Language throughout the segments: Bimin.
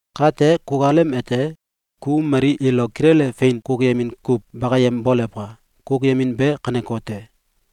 Kate kukalem ete, ku mali ilo kilele fein kukuyemin kuw bakayem bolewka! Kukuyemin be kanekote: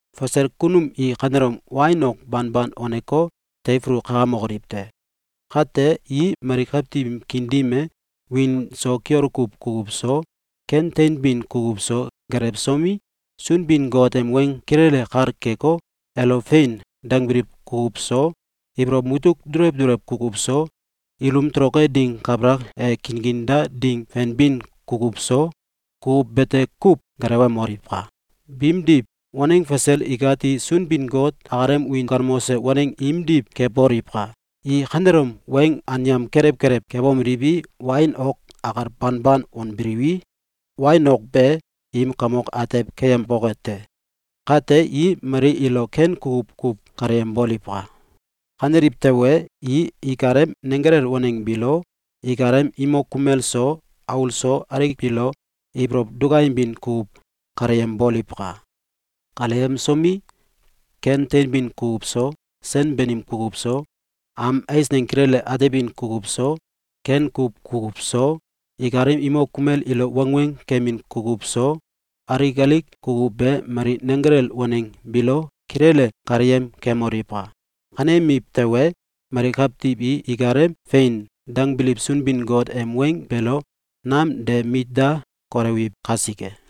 Fasel kunum i kanelom wain ok banban waneko, teifulu kakamokoliw te! Kate i mali kawtiw im kiin dim e wiin so kiol kuw kukuw so, ken teinbin kukuw so, gelewsomi, Sunbin-Got em weng kilele kal keko, elo “Fein!”, dangbiliw kukuw so, ibolow mutuk dulew duluew kukuw so, ilum toloke ding kabalak e, kinkinda ding fenbin kukuw so, kukuw bete kuw gelewemoliwka! Biimdiw, waneng fasel ikati Sunbin-Got akalem wiin galmose waneng imdiw keboliwka! I kanelom weng anyam kelew kelew kebomeliwi, wain ok akal banban wanbiliwi, wain ok be im kamok atew keyemboke te! Kate i mali ilo ken kukuw kuw kaleyemboliwka! Kaneliw tewe, i ikalem nenggelel waneng biilo ikalem imok kumel so, aul so alik biilo ibolow dukayembin kukuw kaleyemboliwka! Kaleyemsomi, ken teinbin kukuw so, sen banim kukuw so, am eisneng kilele atebin kukuw so, ken kuw kukuw so, ikalem imok kumel ilo wangweng kemin kukuw so, alik alik kukuw be mali nenggelel waneng biilo kilele kaleyem kemoliwka! Kanemiw tewe, mali kawtiw i ikalem “Fein!”, dangbiliw Sunbin-Got em weng beelo nam de mit da kolewiw kasike.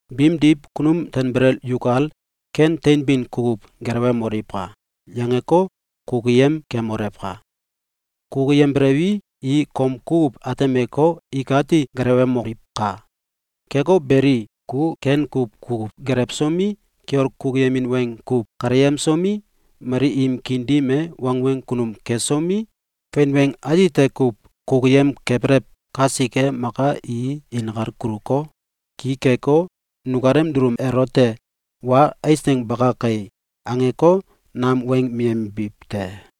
Biimdiw, “Kunum tanbelel yukal ken teinbin kukuw gelewemoliwka!”, yangeko, kukuyem kemolewka! Kukuyembelewi, i kom kukuw atemeko, ikati gelewemoliwka! Keko beli, ku ken kuw kukuw gelewsomi, kiol kukuyemin weng kuw kaleyemsomi, mali im kiin dim e wangweng kunum kesomi, fein weng atite kuw kukuyemkabelew kasike, maka i inkal kuluko, ki keko, nukalem dulum elote “Wa eisneng baka kai!”, angeko, nam weng miyembiw te.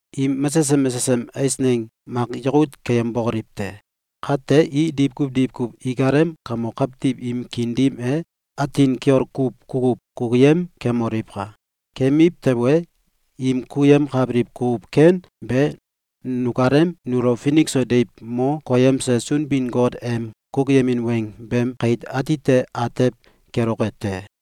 im mesesem mesesem eisneng mak yakut keyembokoliw te! Kate, i diwkuw diwkuw ikalem kamok kawtiw im kiin dim e atin kiol kuw kukuw kukuyem kemoliwka! Keemiw tewe, im kukuyemkabiliw kukuw ken be nukalem nulo finik so deiw mo koyemse Sunbin-Got em kukuyemin weng beem kait atite atew keloke te.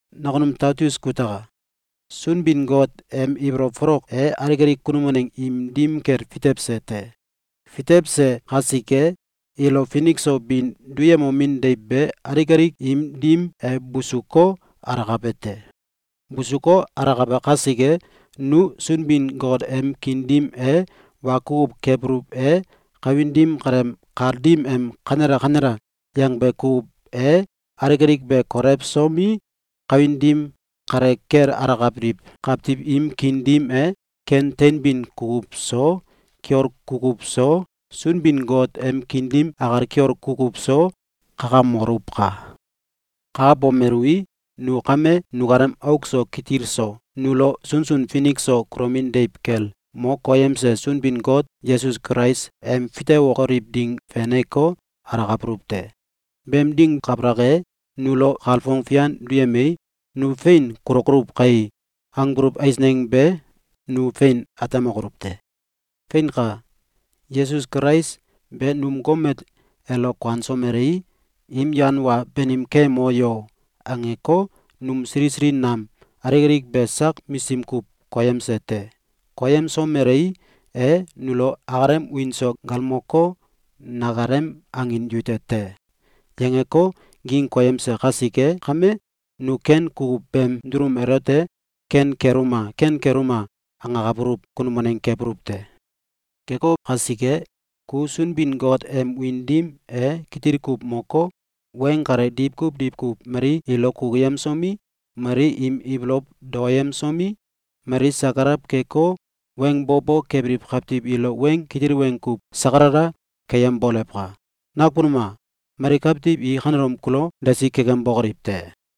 Nakunum Taitus kutaka! Sunbin-Got em ibolow folok e alik alik kunum waneng im dim kel fitewse te. Fitewse kasike, ilo finik so bin duyemomin deiw be alik alik im dim e busuko, alakabe te. Busuko, alakabe kasike, nu Sunbin-Got em kiin dim e wa kukuw kebuluw e, kawin dim kaleem kal dim em “Kanela! Kanela!”, yangbe kukuw e, alik alik be kolewsomi, kawin dim kale kel alakabiliw kawtiw im kiin dim e ken teinbin kukuw so, kiol kukuw so, Sunbin-Got em kiin dim akal kiol kukuw so, kakamoluwka! Kakabomeluwi, nu kame nukalem auk so kitil so, nulo sunsun finik so kulomin deiw kel mo koyemse Sunbin-Got Yesus Kulais em fitewokoliw ding feneko, alakabuluw te. Beem ding kabalak e, nulo kalfong fian duyemei, “Nu fein kulokoluw kai!”, angbuluw eisneng be nu fein atemokoluw te. Feinka! Yesus Kulais be num gomet elo kuansomelei, “Im yan wa banim keyemo yo!”, angeko, num sili sili nam alik alik be sak misim kuw koyemse te. Koyemsomelei, e nulo akalem wiin so galmoko, “Nakalem angin yute te!”, yangeko, ging koyemse kasike kame, nu ken kukuw beem dulum elote “Ken keluma! Ken keluma!”, angakabuluw kunum waneng kebuluw te. Keko kasike, ku Sunbin-Got em wiin dim e kitil kuw moko, weng kale diwkuw diwkuw mali ilo kukuyemsomi, mali im ibolow daoyemsomi, mali sakalaw keko, weng bo bo kebiliw kawtiw ilo weng kitil weng kuw sakalala keyembolewka! Nakunum a! Mali kawtiw i kanelom kulo desi kekembokoliw te!